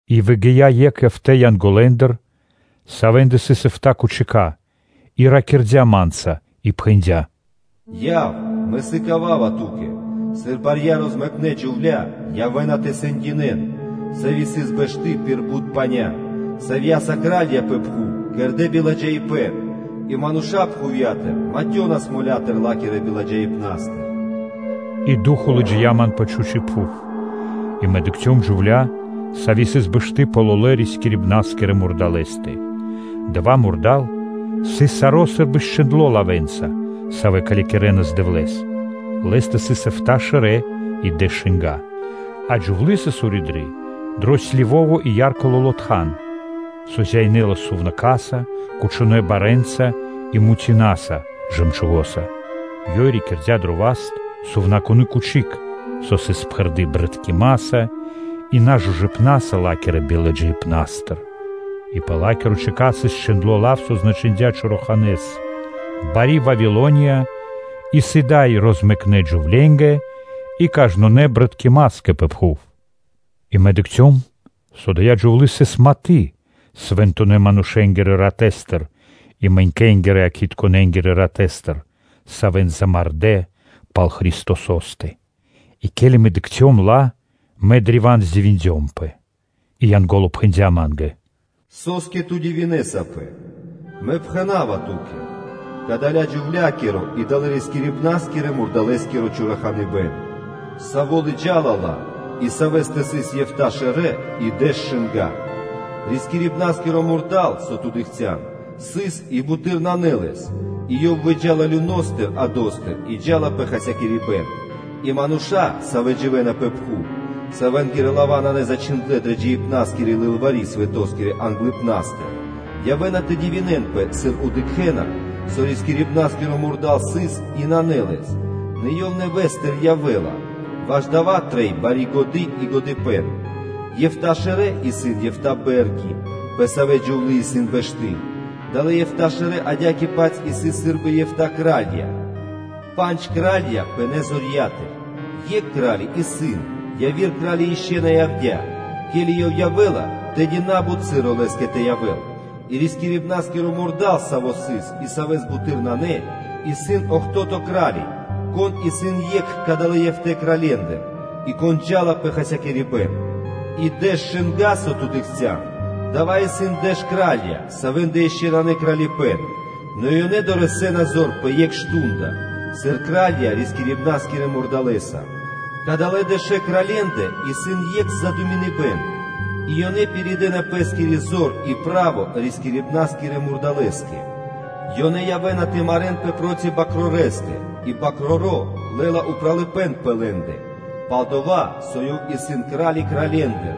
И выгия́ екх эфта́ (эфтанэ) Янголэндыр, савэ́стэ сыс эфта́ тахтая́, и ракирдя́ ма́нца и пхэндя́: “Яв, мэ сыкава́ва ту́кэ сыр барья розмэкнэ джувля́ явэ́на тэ сэндинэ́н, сави́ сыс бэшты пир бут паня́, савья́са кра́лья пэ пхув кэрдэ́ биладжаипэ́н и мануша́ пхувья́тыр матёнас моля́тыр ла́кирэ биладжаипнастыр.” И Ду́хо (Фа́но) лыджия́ ман пэ чхучи́ пхув. И мэ дыкхцём джувля́, сави́ сыс бэшты пэ лолэ́-рискирибна́скирэ мурдалэ́стэ. Дава́ мурда́л сыс саро́, сы́рбы счхиндло лавэ́нца, савэ́ калякирэнас Дэвлэ́с. Лэ́стэ сыс эфта́ шэрэ́ и дэш шынга́ (ро́ги). И джувлы́ сыс уриды дро сливитко (кхилавитко) и ярко лоло́ тхан, со зяинэлас сувнака́са, кучонэ́ барэ́нца и мутинаса (жэмчугоса). Ёй рикирдя дро пэ́скиро васт сувнакуно́ тахта́й, саво́ сыс пхэрдо́ джунгалыпнаса (брыткимаса) и нажужыпнаса ла́кирэ биладжаипнастыр. И пэ ла́киро чэкат сыс чхиндло́ лав, со значындя чораханэ́с: “Бари Вавилония – исын дай розмэкнэ джувленгэ и кажнонэ́ джунгалыпнаскэ пэ пхув.” И мэ дыкхцём, со ада́я джувлы́ сыс маты свэнтонэ́-манушэ́нгирэ ратэстыр и мэнькэнгирэ-якхитконэнгирэ ратэстыр, савэ́н замардэ́ пал Христосо́стэ. И ке́ли мэ дыкхцём ла, мэ древа́н дивиндёмпэ. И Янго́ло пхэндя́ ма́нгэ: “Со́скэ ту дивинэсапэ? Мэ пхэна́ва ту́кэ кадаля-джувля́киро и далэ́-рискирибна́скирэ-мурдалэскиро чораханыбэн, саво́ лыджа́ла ла и савэ́стэ сыс эфта́ шэрэ́ и дэш шынга́ (ро́ги). Рискирибна́скиро мурда́л, савэ́с ту дыкхця́н, сыс и буты́р нанэ лэс, и ёв выджа́ла люностыр (адостыр) и джа́ла пэ хасякирибэн. И мануша́, савэ́ дживэ́на пэ пхув, савэнгирэ лава́ нанэ зачхиндлэ́ дрэ джиибна́скири лылвари́ свэто́скирэ англыпна́стыр, явэ́на тэ дивинэнпэ, сыр дыкхэ́на, со рискирибна́скиро мурда́л сыс, и нанэ лэс, нэ ёв нэвэ́стыр явэ́ла. Ваш дава́ трэй бари годы́ и годыпэ́н. Ефта шэрэ́ исын эфта́ бэ́рги, пэ савэ́ джувлы́ исын бэшты. Далэ́ эфта́ шэрэ́ адя́кэ-паць исын сы́рбы эфта́ кра́лья, пандж кра́лья пынэ́ зорья́тыр, екх кра́ли исын, яви́р кра́ли ишчо (инкэ́) на явдя́; ке́ли ёв явэ́ла, тэды на́бут часо лэ́скэ тэ явэ́л. И рискирибна́нскиро мурда́л, саво́ сыс и савэ́с буты́р нанэ, исын охто́то (бидуе́нгиро дэ́што) кра́ли, кон исын екх кадалэ́ эфта́ (эфтэ) кральендыр, и кон джа́ла пэ хасякирибэн. И дэш шынга́, со ту дыкхця́н, дава́ исын дэш кра́лья, савэ́ндэ ишчо (инкэ́) нанэ кралипэ́н, нэ ёнэ дорэсэ́на зор пэ екх мардо́ (шту́нда), сыр кра́лья рискирибна́скирэ мурдалэса. Кадалэ́ дэшэ кралье́ндэ исын екх мы́сля, и ёнэ пиридэна пэ́скири зор и право рискирибна́скирэ мурдалэ́скэ. Ёнэ явэ́на тэ марэ́нпэ проти Свэнтонэ́ Бакрорэстэ и Свэ́нто Бакроро́ лэ́ла упралыпэ́н пэ лэ́ндэ, пал-дова́ со Ёв исын Кра́ли Кралье́ндыр,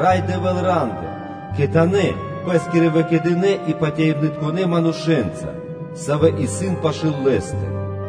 Рай Дэвэ́л ра́ндыр, кхэтанэ́ пэ́скирэ выкэдынэ́ и патяибнытконэ манушэ́нца, савэ́ исын пашы́л Лэ́стэ.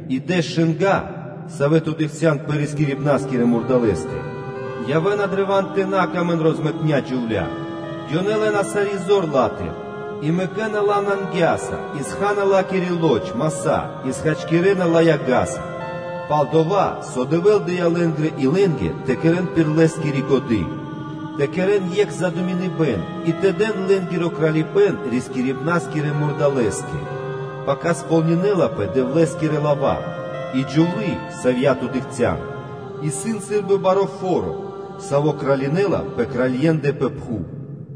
И дэш шынга́, савэ́ ту дыкхця́н пэ рискирибна́скирэ мурдалэ́стэ, явэ́на древа́н тэ на сыкавэ́н паты́в розмэкнэ джувля́кэ: ёнэ лэ́на сари́ зор ла́тыр и мэкэ́на ла нангяса и ха́на сарэ́са ла́кири лоч (плоть) и хачкирэна ла яга́са. Пал-дова́ со Дэвэ́л дыя́ лэ́нгирэ илэнгэ тэ кэрэ́н пир Лэ́скири годы́, тэ кэрэ́н екх задуминыбэн и тэ дэн лэ́нгиро Кралипэ́н рискирибна́скирэ мурдалэскэ, пака сполнинэнапэ Дэвлэ́скирэ лава́. И джувлы́, савья́ ту дыкхця́н, исын сы́рбы баро́ фо́ро, саво́ кралинэла пэ кралье́ндэ пэ пхув.”